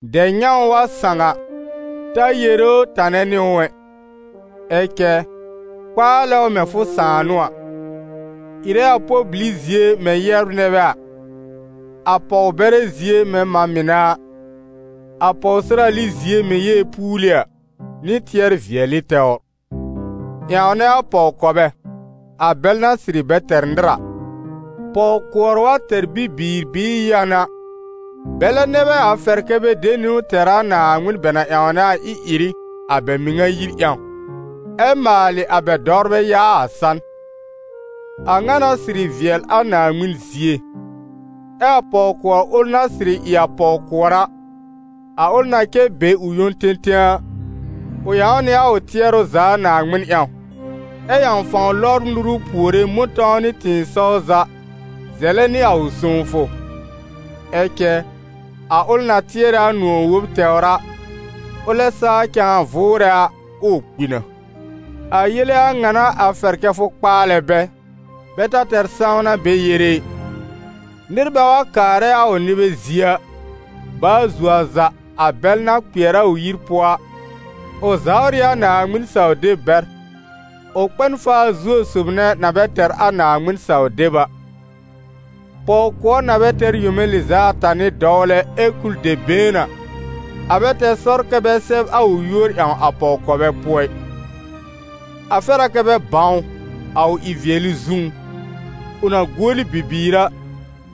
Dɛb-nyãw wa sãw a, ta yere ʋ tanɛ nɩ ʋ ɛ, ɛ cɛ kpaalɛ ʋ mɛ̃ fʋ sãà n'ʋ a. Ɩrɛ a pɔl-bili zie mɛ̃ yɛbr nɛ bɛ a, a pɔw-bɛrɛ zie mɛ̃ mã mɩnɛ a, a pɔwsɩrali zie mɛ̃ yeepuuli a, nɩ tɩɛr-vɩɛlɩ tɛwr. Ƴãwnɛ a pɔw-kɔbɛ, a bɛl na sɩrɩ bɛ tɛr nɩr a. Pɔw-kʋɔr wa tɛr bibiir bɩɩ yãn a, bɛlɛ nɛ bɛ a fɛrɛ kɛ́ bɛ de niwn tɛr a Naaŋmɩn bɛ na ƴãwnɛ a ɩ-ɩrɩ, a bɛ mɩŋa yir ƴãw, ɛ maalɩ a bɛ dɔwrbɛ yaa a san. A ŋa n'a sɩrɩ vɩɛl a Naaŋmɩn zie. Ɛ a pɔw-kʋɔr ʋl na sɩrɩ ɩ a pɔw-kʋɔr a, a ʋl na cɛ be ʋ yõ tẽtẽ a, ʋ ƴãw nɩ a ʋ tɩɛrʋ za a Naaŋmɩn ƴãw, ɛ ƴãw fãw lɔbr nuru puore mʋ̃tɔ̃w nɩ tɩ̃ɩsɔw za zɛlɛ nɩ a ʋ sõwfʋ. Ɛ cɛ a ʋl na tɩɛrɛ a nʋ̃ɔ̀ wob tɛwr a, ʋlɛ saa cãa vʋʋrɛ a, ʋʋ kpi na. A yele a ŋa n'a a fɛr kɛ fʋ kpaalɛ bɛ, bɛ ta tɛr sãwna bɛ yere ɩ. Nɩr bɛ wa kaarɛ a ʋ nɩbɛ zie a, baa zuo a za a bɛl na kpɩɛr a ʋ yir pʋɔ a, ʋ zawr ɩ a Naaŋmɩn-saw-deb bɛr, ʋ kpɛ n faa zuo sob nɛ na bɛ tɛr a Naaŋmɩn-saw-deb a. Pɔw-kʋɔr na bɛ tɛr yome lɩz'a ata nɩ dɔwlɛ, ɛ kul dɛb been a, a bɛ tɛr sɔr kɛ́ bɛ sɛb a ʋ yúor ƴãw a pɔw-kɔbɛ pʋɔ ɩ. A fɛr a kɛ bɛ bãw ʋ, a ʋ ɩ-vɩɛlɩ zũú: ʋ na guoli bibiir a,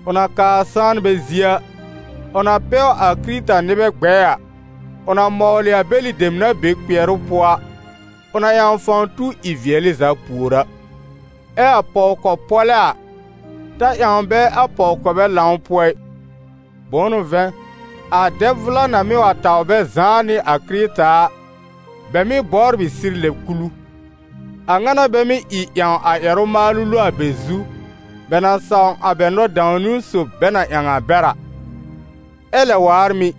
ʋ na kaa sãanbɛ zie a, ʋ na pɛw a Kɩrɩta-nɩbɛ gbɛɛ a, ʋ na mɔwlɩ a bɛlɩ dem na be kpɩɛrʋ pʋɔ a, ʋ na ƴãw fãw tu ɩ-vɩɛlɩ za pùor a. Ɛ a pɔw-kɔ-pɔ́lɛ́ a, ta ƴãw bɛ a pɔw-kɔbɛ lãw pʋɔ ɩ. Bʋ̃ʋ n'ʋ vɛ̃, a dɛb vʋla na mɩ́ wa taw bɛ zãá nɩ a Kɩrɩta a, bɛ mɩ́ bɔbr ɩ sɩr lɛb-kulu, a ŋa n'a bɛ mɩ́ ɩ ƴãw a ƴɛrʋ-maalʋ lo a bɛ zu, bɛ na sãw a bɛ nɔ-dãw-niwn sob bɛ na ƴãw a bɛr a. Ɛ lɛ waar mɩ̀,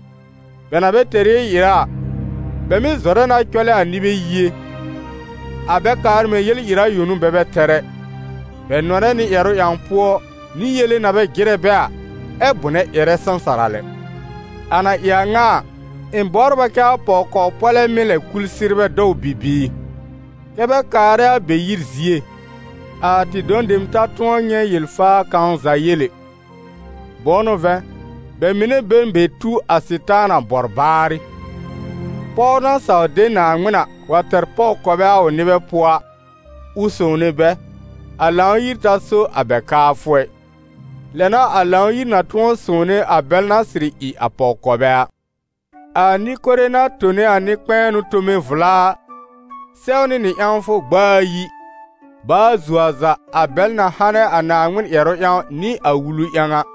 bɛ na bɛ tɛr yel-ɩra a, bɛ mɩ́ zɔrɛ na cɔlɛ a nɩbɛ yie. A bɛ kaar mɛ̃ yel-ɩra yõ n'a bɛ bɛ tɛr ɛ, bɛ nɔnɛ nɩ ƴɛrʋ ƴãw pʋɔ, nɩ yele na bɛ jɩrɛ bɛ a, ɛ bʋnɛ ƴɛrɛ sãsara lɛ. A na ɩ a ŋa a, ɩ̃ bɔbr a kɛ a pɔw-kɔ-pɔ́lɛ́ mɩ́ lɛb kul sɩrbɛ dɔw bibiir, kɛ́ bɛ kaarɛ a bɛ yir zie, a tɩ dɔ̃ dem ta tʋ̃ɔ nyɛ̃ yel-faa kãw za yel ɛ. Bʋ̃ʋ n'ʋ vɛ̃, bɛ mɩnɛ be n be tu a Sɩtaana bɔr baarɩ. Pɔw na saw de Naaŋmɩn a, wa tɛr pɔw-kɔbɛ a ʋ nɩbɛ pʋɔ a, ʋ sõwne bɛ, a Lãw-yir ta so a bɛ kaafʋ ɛ, lɛ n'a a Lãw-yir na tʋ̃ɔ sõwne a bɛl na sɩrɩ ɩ a pɔw-kɔbɛ a. A nɩ-kore na tone a nɩ-kpɛ̃ɛnʋ tome vla a, sɛwnɩ nɩ ƴãwfʋ gb'a ayi, baa zuo a za, a bɛl na hanɛ a Naaŋmɩn ƴɛrʋ ƴãw nɩ a wulu ƴãw a.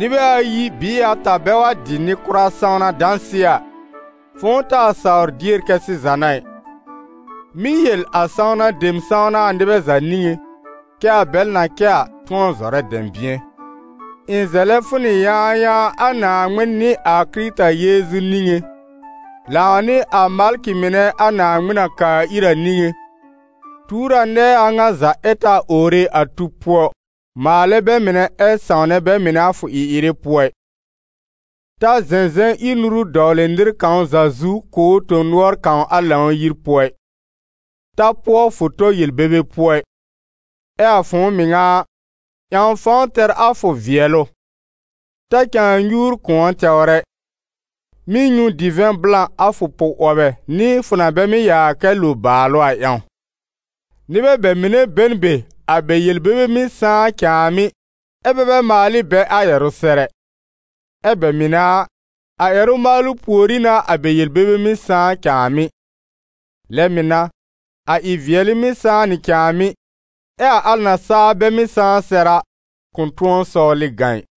Nɩbɛ ayi bɩɩ ata bɛ wa dɩ nɩ-kʋra sãwna dãsɩɛ a, fʋ̃ʋ taa sawr dier kɛ́ sɩza n'a ɩ. Mɩ́ yel a sãwna dem sãwna a nɩbɛ za niŋé, kɛ́ a bɛl na cɛ a, tʋ̃ɔ zɔrɛ dɛ̃bɩ̃ɛ. Ɩ̃ zɛlɛ fʋ nɩ yãayãa a Naaŋmɩn nɩ a Kɩrɩta Yeezu niŋé, lãw nɩ a malkɩ mɩnɛ a Naaŋmɩn na kaa ir a niŋé, tuur a nɛɛ a ŋa za ɛ ta owre a tub pʋɔ, maalɛ bɛ mɩnɛ ɛ sãwnɛ bɛ mɩnɛ a fʋ ɩ-ɩrɩ pʋɔ ɩ. Ta zɛ̃zɛ̃ ír nuru dɔwlɩ nɩr kãw za zu kʋ̀ ʋ tõ-nʋɔr kãw a Lãw-yir pʋɔ ɩ, ta pʋɔ fʋ tɔ yel-bebe pʋɔ ɩ. Ɛ a fʋ̃ʋ mɩŋa a, ƴãw fãw tɛr a fʋ vɩɛlʋ. Ta cãa nyuur kʋ̃ɔ tɛwr ɛ. Mɩ́ nyũ divɛ̃ blã, a fʋ pʋ-'wɔbɛ nɩ fʋ na bɛ mɩ́ yaa kɛ lo bàalʋ a ƴãw. Nɩbɛ bɛ mɩnɛ be n be a bɛ yel-bebe mɩ́ sãá cãàmɩ́, ɛ́ bɛ bɛ maal ɩ bɛ a ƴɛrʋ sɛr ɛ; ɛ bɛ mɩnɛ a, a ƴɛrʋ maalʋ pùorí n'a a bɛ yel-bebe mɩ́ sãá cãàmɩ́. Lɛ mɩ̀ n'a, a ɩ-vɩɛlɩ mɩ́ sãá nɩ cãàmɩ́, ɛ a al na saa bɛ mɩ́ sãá sɛr a, kʋ̃ tʋ̃ɔ sɔwlɩ gã ɩ.